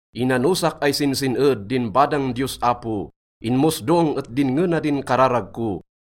Inanosak ay sinsin-ed din badang Diyos Apo, inmosdong et dinnge na din kararag ko.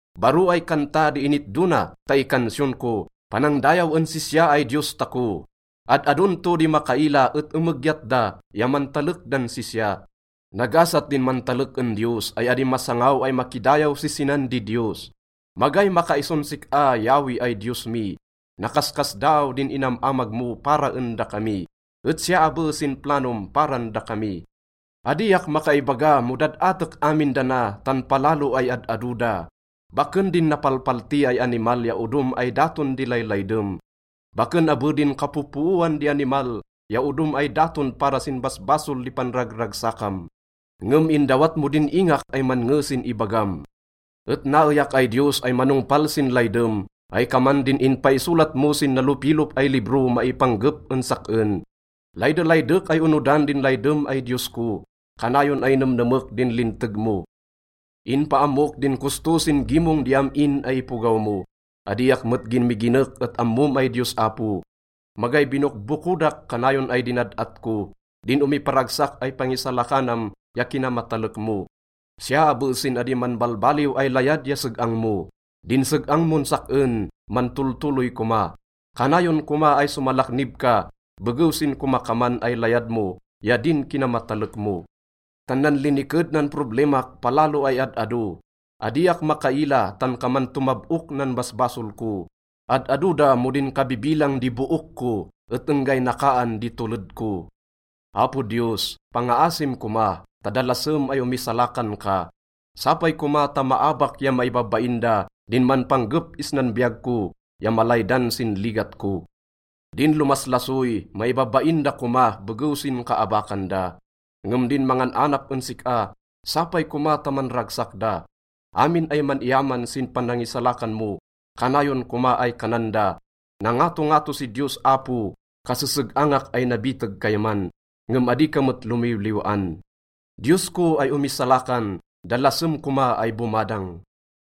Baro ay kanta di initdo na ta ikansiyon ko. Panangdayaw en sisya ay Diyos tako. Ad-adon to di makaila et emegyat da ya mantalek dan sisya. Nagasat din mantalek en Diyos ay adi masangaw ay makidayaw si sinan didiyos. Magay makaison sik-a, Yahweh ay Diyos mi. Nakaskasdaaw din inam-amag mo para en dakami, et siya abe sin planom paran dakami. Adiak makaibaga mo dad-atek amin dana, tan palalo ay ad-ado da. Baken din napalpalti ay animal ya odom ay daton di laylaydem. Baken abe din kapopooan di animal ya odom ay daton para sin basbasol di panragragsakam. Ngem indawat mo din ingak ay mannge sin ibagam. Et naeyak ay Diyos ay manongpal sin laydem ay kaman din inpaisolat mo sin nalopilop ay libro maipanggep en sak-en. Laydelaydek ay onodan din laydem ay Diyos ko. Kanayon ay nemnemek din linteg mo. Inpaammok din kosto sin gimong di am-in ay ipogaw mo, adiak met ginmiginek et ammom ay Diyos Apo. Magay binokbokodak, kanayon ay dinad-at ko din omiparagsak ay pangisalakanam ya kinamatalek mo, siya abe sin adi manbalbaliw ay layad ya seg-ang mo. Din seg-ang mon sak-en, mantoltoloy koma. Kanayon koma ay somalaknib ka, begew sin komakaman ay layad mo ya din kinamatalek mo. Tan nanliniked nan problemak, palalo ay ad-ado. Adiak makaila tan kaman tomab-ok nan basbasol ko, ad-ado da mo din kabibilang di book ko, et enggay nakaan di toled ko. Apo Diyos, pangaasim koma ta dalasem ay omisalakan ka. Sapay koma ta maabak ya maibabain da din manpanggep isnan biyag ko ya malaydan sin ligat ko. Din lomaslasoy, maibabain da koma begew sin kaabakan da. Ngem din mangan-anap en sik-a, sapay koma ta manragsak da. Amin ay man-iyaman sin panangisalakan mo, kanayon koma ay kanan da, “Nangatongato si Diyos Apo.” Kaseseg-angak ay nabiteg kayman, ngem adi ka met lomiwliw-an. Diyos ko ay omisalakan, dalasem koma ay bomadang.